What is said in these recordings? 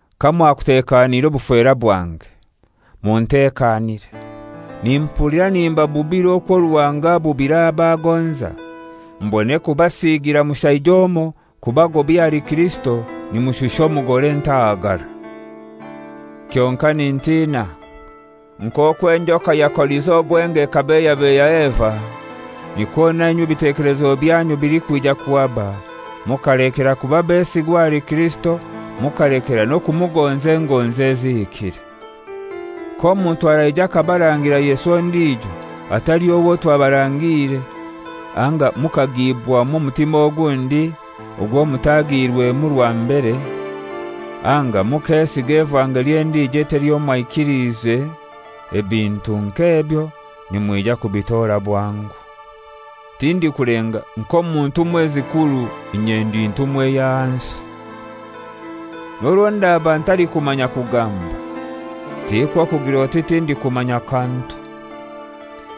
Kamwakutekaniire obufera bwange! Muntekanire. Nimpulira nimbabubira okwo Ruhanga abubira ab'agonza, mbone kubasiigira mushaija omoi kubagobya ahali Kirisito nimushusha omugore entahagara. Kyonkai nintina. Nk'okwo enjoka yakolize obwenge ekabeiyabeiya Eva, nikwo nainywe ebitekelezo byanyu bilikwija kuhaba mukalekera kuba besigwa ahali Kirisito, mukalekera n'okumugonza engonzi ezihikire. K'omuntu araija akabarangira Yesu ondijo atali owo twabarangiire, anga mukagibwamu omutima ogundi ogwo mutagirwemu rwa mbere, anga mukesiga evangeli endijo etali eyo mwaikiliize, ebintu nk'ebyo nimwija kubitora bwangu. Tindikulenga nk'omu ntumwa ezikuru inye ndi ntumwa ey'ahansi. N'orwo ndaba ntalikumanya kugamba, tikwo kugir'oti tindikumanya kantu.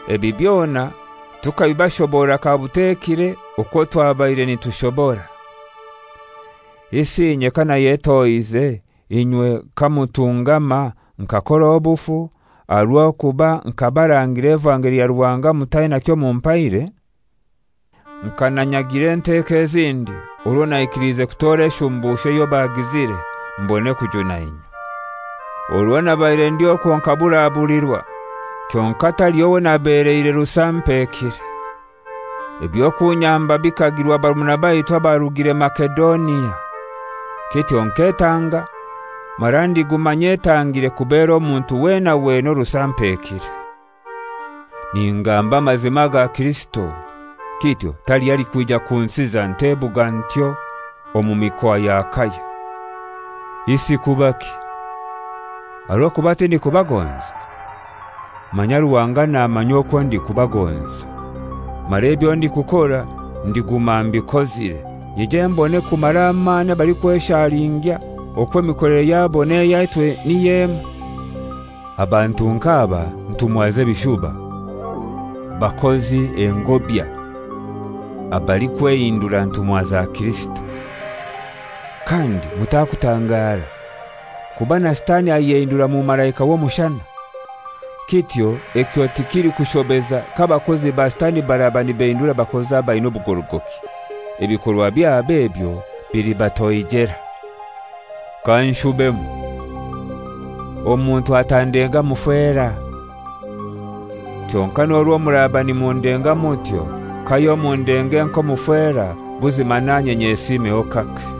Ebi byona tukabibashoborora kabutekire okwo twabaire nitushobora. Isi inye kanayetohize inywe kamutungama, nkakora obufu, aha rw'okuba nkabarangira evangeli ya Ruhanga mutaina kyomumpaire? Nka nanyagire enteko ezindi, orwo naikiliize kutora eshumbusho eyo bagizire, mbone kujuna inywe! Orwo nabaire ndi okwo nkaburabulirwa, kyonkai taliho wonabeleire rusampekire. Eby'okunyamba bikagirwa barumuna baitu abarugire Masedonia. Kityo nketanga mara ndiguma nyetangire kubera omuntu wena wena orusampekire. Ningamba amazima aga Kirisito; kityo taliho alikwija kunsiza ntebuga ntyo omu mikoa ya Akaya. Isi kubaki? Aha rw'okuba tindikubagonza? Manya Ruhanga namanya okwo ndikubagonza. Mara ebyo ndikukora ndiguma mbikozire, nyije mbone kumara amani abalikweshalingya okwo emikolere yabo n'eyaitu niy'emoi. Abantu nk'aba ntumwa z'ebishuba, bakozi engobya, abalikwehindura ntumwa za Kirisito. Kandi mutakutangara! Kuba na Sitani ayehindura mumalaika w'omushana. Kityo ekyo tikilikushobeza k'abakozi ba Sitani baraba nibehindura bakozi abaina obugorogoki. Ebikorwa byabo ebyo bilibatoijera. Kanshubemu: Omuntu atandenga mufera. Kyonkai n'orwo muraba nimundenga mutyo, kayo mundenge nk'omufera, buzima nanye nyesimeho kake.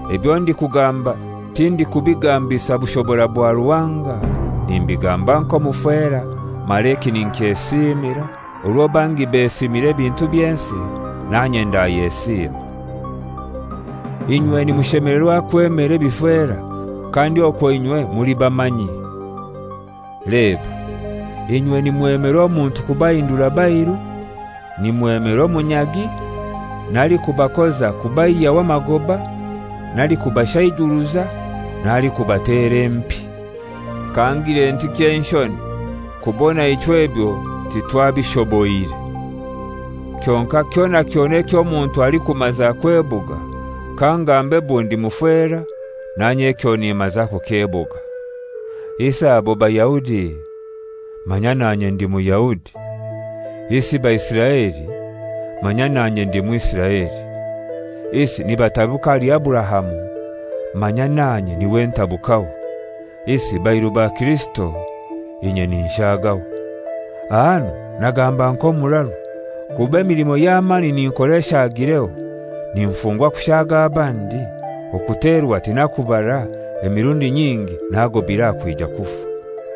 Ebyo ndikugamba tindikubigambisa bushobora bwa Ruhanga, nimbigamba nk'omufera, mara eki ninkyesiimira; orwo bangi besiimira ebintu by'ensi, nanye ndayesiima. Inywe nimushemelerwa kwemera ebifera, kandi okwo inywe muli bamanyi! Leba, inywe nimwemera omuntu kubahindura bairu, nimwemera omunyagi, n'alikubakoza kubaihyaho amagoba, n'alikubashaijuruza, n'alikubatera empi. Kangire nti ky'enshoni, kubona ichwe ebyo titwabishoboire! Kyonkai kyona kyona eky'omuntu alikumaza kwebuga, kangambe bundi mufera, nanye ekyo nimaza kukyebuga. Isi abo Bayahudi? Manya nanye ndi Muyahudi. Isi Baisiraeli? Manya nanye ndi Mwisiraeli. Isi nibatabuka ahali Aburahamu? Manya nanye n'iwe ntabukaho! Isi bairu ba Kirisito? Inye ninshaagaho; ahanu nagamba nk'omuraru, kuba emilimo y'amani ninkora eshaagireho, ninfungwa kushaaga abandi, okuterwa tinakubara, emirundi nyingi nagobire aha kwija kufa.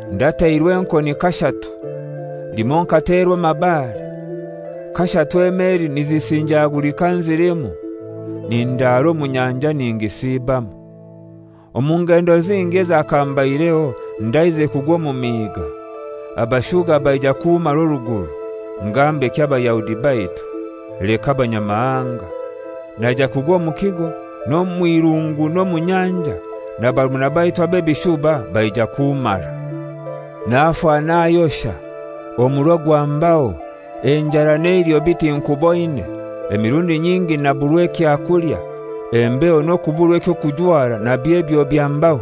Ndateirwe enkoni kashatu; limoi nkaterwa amabare, kashatu emeli nizisinjagulika nzilimu, nindara omu nyanja ningisibamu. Omu ngendo zingi ezakambaireho ndaizire kugwa omu miiga, abashuga baija kummara oruguru, ngambeki Abayahudi baitu, leka abanyamahanga, naija kugwa omu kigo, n'omu irungu n'omu nyanja, na barumuna baitu ab'ebishuba baija kummara. Nafa nayosha, omuro gwambaho, enjara n'eiliho biti nkuboine, emirundi nyingi naburwa ekyakulya, embeho n'okuburwa eky'okujwara nabyo ebyo byambaho.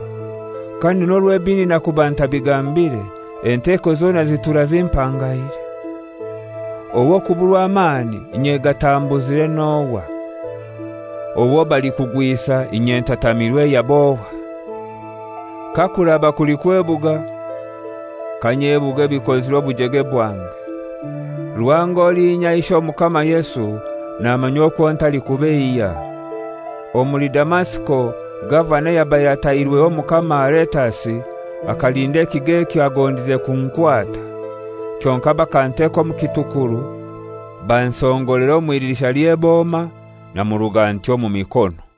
Kandi n'orwo ebindi nakuba ntabigambire, enteko zona zitura zimpangaire. Ow'okuburwa amani inye gatambuzire n'ohai? Owo balikugwisa inye ntatamirwe yab'ohai? Kakuraba kuli kwebuga, kanyebuge ebikozirwe obujege bwange. Ruhanga olinya Ishe Omukama Yesu namanya okwo ntalikubeiya. Omuli Damasiko gavana ayabaire atairweho Omukama Aretasi, akalinda ekigo ekyo agondize kunkwata. Kyonkai bakanteka omu kitukuru bansongolera omw'idirisha ly'orukuta namuruga ntyo omu mikono.